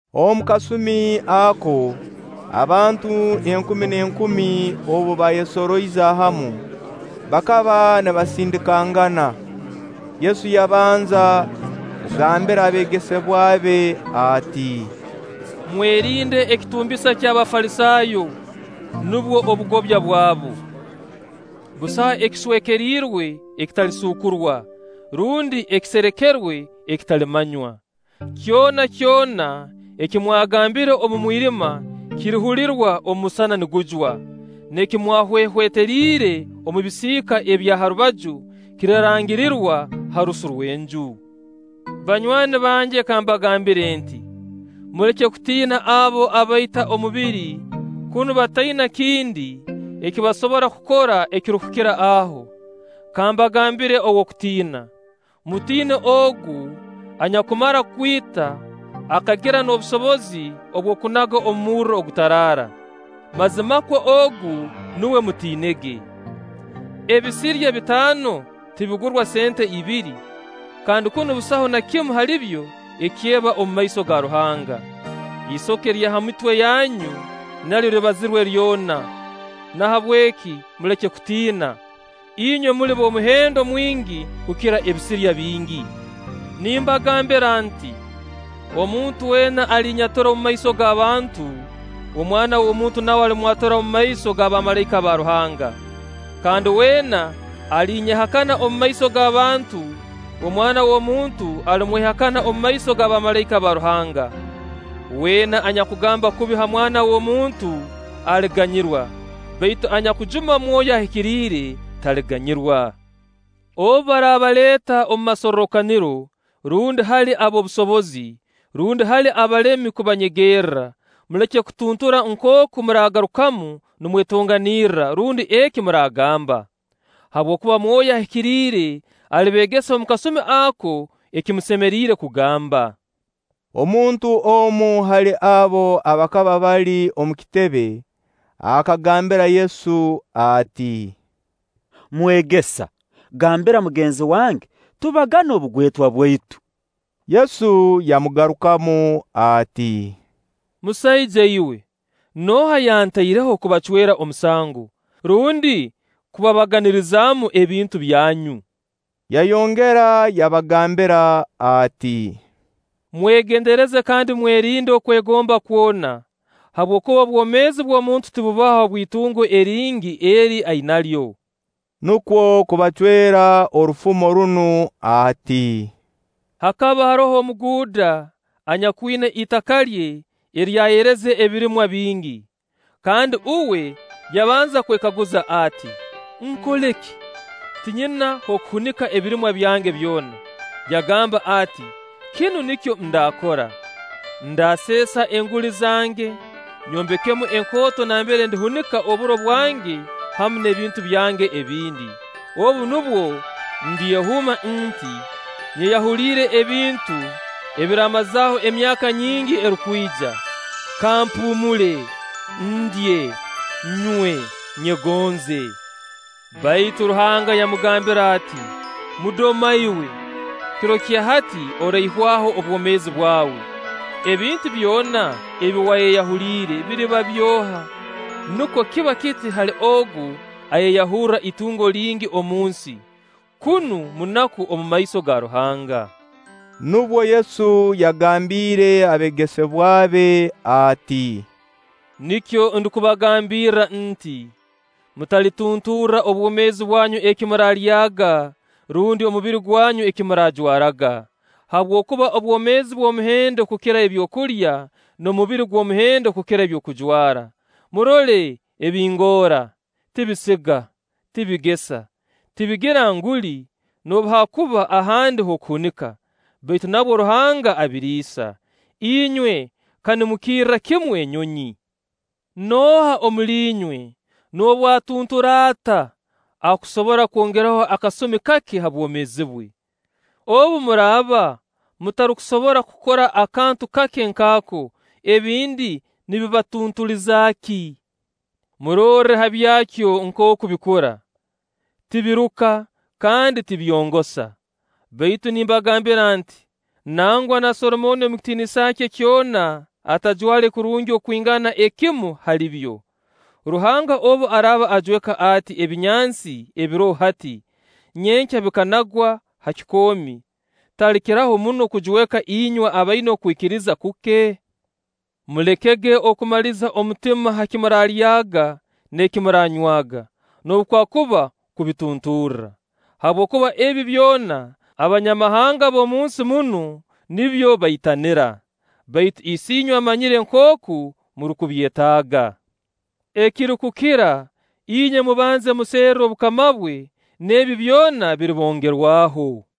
Omu kasumi ako, abantu enkumi n'enkumi obu baayesoroize hamu, bakaba nibasindikangana, Yesu yabanza kugambira abeegesebwa be ati: “Mwerinde ekitumbisa ky'Abafalisaayo, nubwo obugobya bwabu. Busaho ekiswekeriirwe ekitalisuukurwa, rundi ekiserekerwe ekitalimanywa. Kyona kyona eki mwagambiire omu mwirima kirihulirwa omusana nigujwa; n'eki mwahwehweteriire omu bisiika ebya ha rubaju kirirangirirwa ha rusu rw'enju.” “Banywani bange kambagambire nti: Muleke kutiina abo abaita omubiri kunu bataina kindi eki basobora kukora ekirukukira aho. Kambagambire ow'okutiina. Mutiine Ogu anyakumara kwita, akagira n'obusobozi obw'okunaga omu murro ogutaraara. Mazimakwo Ogu nuwe mutiinege! “Ebisirya bitaano tibigurwa sente abiri? Kandi kunu busaho na kimu halibyo ekyeba omu maiso ga Ruhanga. Isoke lya ha mitwe yanyu nalyo libazirwe lyona. Nahabweki muleke kutiina. Inywe muli b'omuhendo mwingi kukira ebisirya bingi!” “Nimbagambira nti: Omuntu weena alinnyatura omumaiso g'abantu, Omwana w'omuntu nawe alimwatura omumaiso ga bamalaika ba Ruhanga; kandi weena alinyehakana omumaiso g'abantu, Omwana w'omuntu alimwehakana omumaiso ga bamalaika ba Ruhanga. Weena anyakugamba kubi ha Mwana w'omuntu aliganyirwa; baitu anyakujuma Mwoyo Ahikiriire taliganyirwa. Obu baraabaleeta omu masorrokaniro, rundi hali ab'obusobozi, rundi hali abalemi kubanyegerra, muleke kutuntura nkooku muraagarukamu nimwetonganirra, rundi eki muraagamba; habwokuba Mwoyo Ahikiriire alibeegesa omu kasumi ako eki musemeriire kugamba.” Omuntu omu hali abo abakaba bali omu kitebe akagambira Yesu ati: “Mwegesa, gambira mugenzi wange tubagane obugwetwa bwaitu.” Yesu yamugarukamu ati: “Musaija iwe, nooha yantaireho kubacwera omusango, rundi kubabaganirizaamu abintu byanyu?” Yayongera yabagambira ati: “Mwegendereze kandi mwerinde okwegomba kwona, habwokuba obwomeezi bw'omuntu tibubaho habw'itungo eringi eri ainalyo.” Nukwo kubacwera orufumo runu ati: “Hakaba haroho omuguuda anyakwina itaka lye eryayereze ebirimwa bingi. Kandi uwe yabanza kwekaguza ati: ‘Nkole ki? Tinyina h'okuhunika ebirimwa byange byona.’ Yagamba ati: ‘Kinu nikyo ndaakora. Ndaaseesa enguli zange, nyombekemu enkooto nambere ndihunika oburo bwange hamu n'ebintu byange ebindi. Obu nubwo ndyehuuma nti Nyeyahuliire ebintu ebirimmazaaho emyaka nyingi erukwija. Kampuumule, ndye, nywe, nyegonze.’ Baitu Ruhanga yamugambira ati: ‘Mudoma iwe! Kiro kya hati oraihwaho obwomeezi bwawe. Ebintu byona ebi wayeyahuliire biriba by'oha?’ Nukwo kiba kiti hali ogu ayeyahurra itungo lingi omu nsi, kunu munaku omu maiso ga Ruhanga.” Nubwo Yesu yagambiire abeegesebwa be ati: “Nikyo ndukubagambirra nti: Mutalitunturra obwomeezi bwanyu eki muraalyaga rundi, omubiri gwanyu eki muraajwaraga. Habwokuba obwomeezi bw'omuhendo kukira ebyokulya, n'omubiri gw'omuhendo kukira ebyokujwara. Murole ebingoora: tibisiga, tibigesa, tibigira nguli noobu haakuba ahandi h'okuhunika; baitu nabwo Ruhanga abiriisa. Inywe ka nimukirra kimu enyonyi! Nooha omuli inywe, noobu atuntura ata, akusobora kwongeraho akasumikake ha bwomeezi bwe? Obu muraaba mutarukusobora kukora akantu kake nk'ako, ebindi nibibatuntuliza ki? Murorre ha byakyo nkooku bikura: tibiruka kandi tibyongosa; baitu nimbagambira nti: Nangwa na Solomooni omu kitiinisa kye kyona atajwale kurungi okwingana ekimu hali byo. Ruhanga obu araaba ajweka ati ebinyansi ebiroho hati, nyenkya bikanagwa ha kikoomi, talikiraho muno kujweka inywe abaina okwikiriza kuke? Mulekege okumaliza omutima ha ki muraalyaga n'eki muraanywaga, noobu kwakuba kubitunturra. Habwokuba ebi byona Abanyamahanga b'omunsi munu nibyo baitanira. Baitu Isiinywe amanyire nkooku murukubyetaaga. Ekirikukira, inywe mubanze muserre obukama bwe, n'ebi byona biribongerwaho.”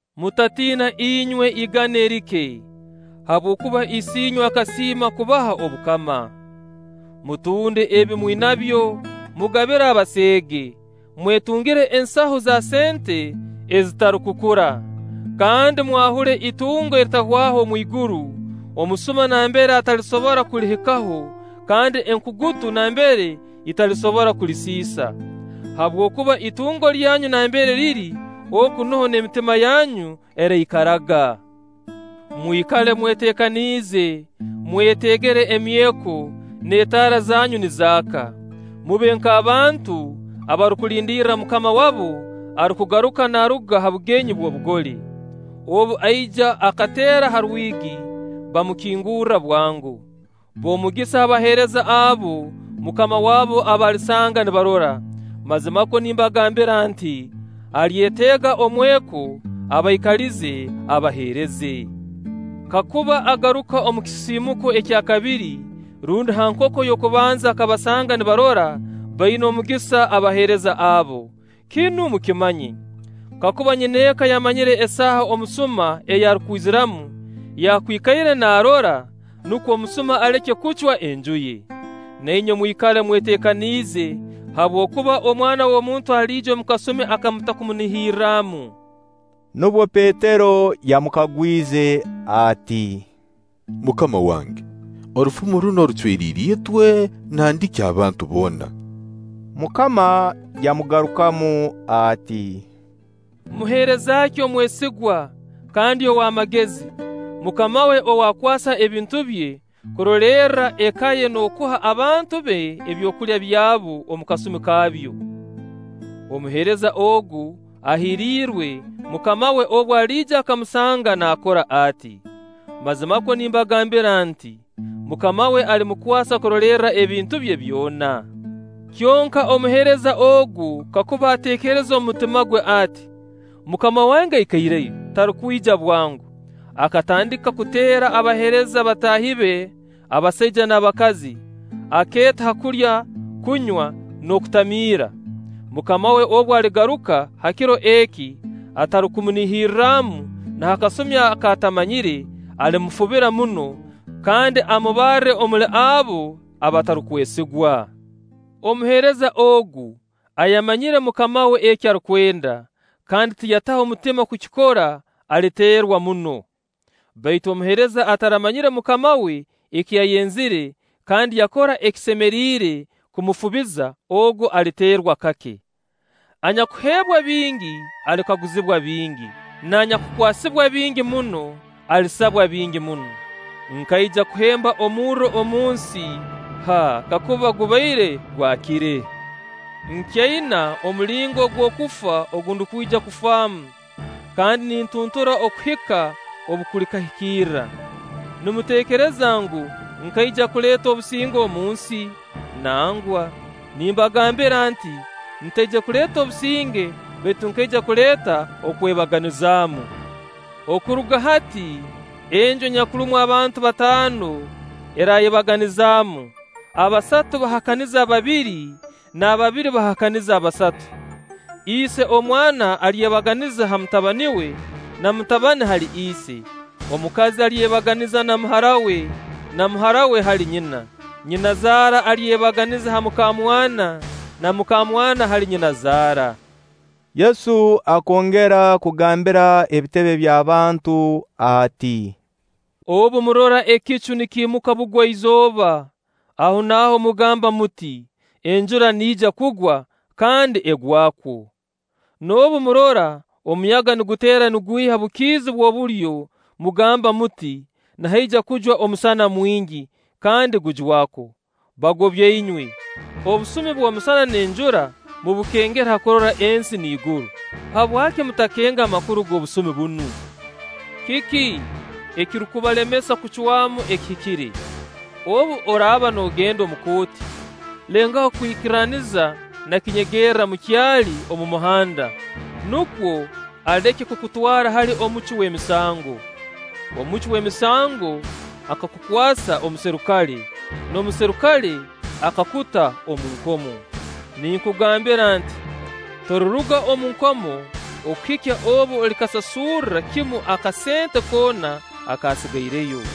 “Mutatiina inywe igana erike! Habwokuba Isiinywe akasiima kubaha obukama. Mutunde ebi mwinabyo, mugabire abaseege; mwetungire ensahu za sente ezitarukukura, kandi mwahule itungo eritahwaho omwiguru, omusuma nambere atalisobora kulihikaho kandi enkugutu nambere italisobora kulisisa. Habwokuba itungo lyanyu nambere liri, oku nuho n'emitima yanyu eraikaraga.” “Mwikale mweteekaniize, mweteegere emyeko, n'etaara zanyu nizaaka. Mube nk'abantu abarukulindirra mukama wabo arukugaruka naaruga ha bugenyi bw'obugole. Obu aija akateera ha rwigi, bamukingurra bwango. B'omugisa abaheereza abo mukama wabu aba alisanga nibarora. Mazimakwo nimbagambira nti: Alyeteega omweko, abaikalize, abaheereze. Kakuba agaruka omu kisisiimuko ekyakabiri rundi ha nkoko y'okubanza akabasanga nibarora, baina omugisa abaheereza abo! “Kinu mukimanye, kakuba nyineeka yamanyire esaaha omusuma ei arukwiziramu, yakwikaire naarora, nukwo omusuma aleke kucwa enju ye. Na inywe mwikale mweteekaniize, habwokuba Omwana w'omuntu aliija omu kasumi aka mutarukumunihirramu.” Nubwo Petero yamukagwize ati: “MUKAMA wange, orufumo runu orucweriire itwe, nandiki abantu boona?” MUKAMA yamugarukamu ati: “Muheereza ki omwesigwa kandi ow'amagezi, mukama we ou akwasa ebintu bye, kurolerra eka ye n'okuha abantu be ebyokulya byabo omu kasumi kaabyo? Omuheereza ogu ahiirirwe mukama we obu aliija akamusanga naakora ati. Mazimakwo nimbagambira nti: Mukama we alimukwasa kurolerra ebintu bye byona. Kyonka omuheereza ogu kakuba ateekereza omu mutima gwe ati: ‘Mukama wange aikaireyo, tarukwija bwango,’ akatandika kuteera abaheereza bataahi be abasaija n'abakazi, akeeta ha kulya, kunywa, n'okutamiira, mukama we obu aligaruka ha kiro eki atarukumunihirramu na ha kasumi ak'atamanyire, alimufubira muno, kandi amubarre omuli abo abatarukwesigwa. “Omuheereza ogu ayamanyire mukama we eki arukwenda, kandi tiyataho mutima kukikora, aliteerwa muno; baitu omuheereza ataramanyire mukama we eki yayenzire, kandi yakora ekisemeriire kumufubiza, ogu aliteerwa kake. Anyakuheebwa bingi, alikaguzibwa bingi; n'anyakukwasibwa bingi muno, alisabwa bingi muno.” “Nkaija kuhemba omurro omunsi; haa, kakuba gubaire gwakire! Nkyaina omulingo ogw'okufa ogu ndukwija kufaamu; kandi nintuntura okuhika obu kulikahikirra! Nimuteekereza ngu, nkaija okuleeta obusinge, omu nsi? Nangwa, nimbagambira nti: Ntaije kuleeta obusinge baitu nkaija kuleeta okwebaganizaamu. Okuruga hati enju enyakurumu abantu bataano eraayebaganizaamu: abasatu bahakanize ababiri, n'ababiri bahakanize abasatu. Ise omwana alyebaganiza ha mutabani we, n'omutabani hali ise; omukazi alyebaganiza na muhara we na muhara we hali nyina; nyinazaara alyebaganiza ha mukamwana, na mukamwana hali nyinazaara.” Yesu akongera kugambira ebitebe by'abantu ati: “Obu murora ekicu nikiimuka Bugwa-izooba, ahonaaho mugamba muti: ‘Enjura niija kugwa’, kandi egwakwo. N'obu murora omuyaga niguteera nigwiha Bukiizi bw'obulyo, mugamba muti: ‘Nihaija kujwa omusana mwingi’, kandi gujwakwo. Bagobya inywe! Obusumi bw'omusana n'enjura mubukengera ha kurora ensi n'iguru; habwaki mutakenga amakuru ag'obusumi bunu?” “Kiki ekirukubalemesa kucwamu ekihikire? Obu oraaba noogenda omukooti, lengaho kwikirraniza na kinyegerra mukyali omu muhanda; nukwo aleke kukutwara hali omucwi w'emisango, omucwi w'emisango akakukwasa omuserikale, n'omuserikale akakuta omu nkomo. Ninkugambira nti: Toliruga omu nkomo okuhikya obu olikasasurra kimu akasente koona akasigaireyo.”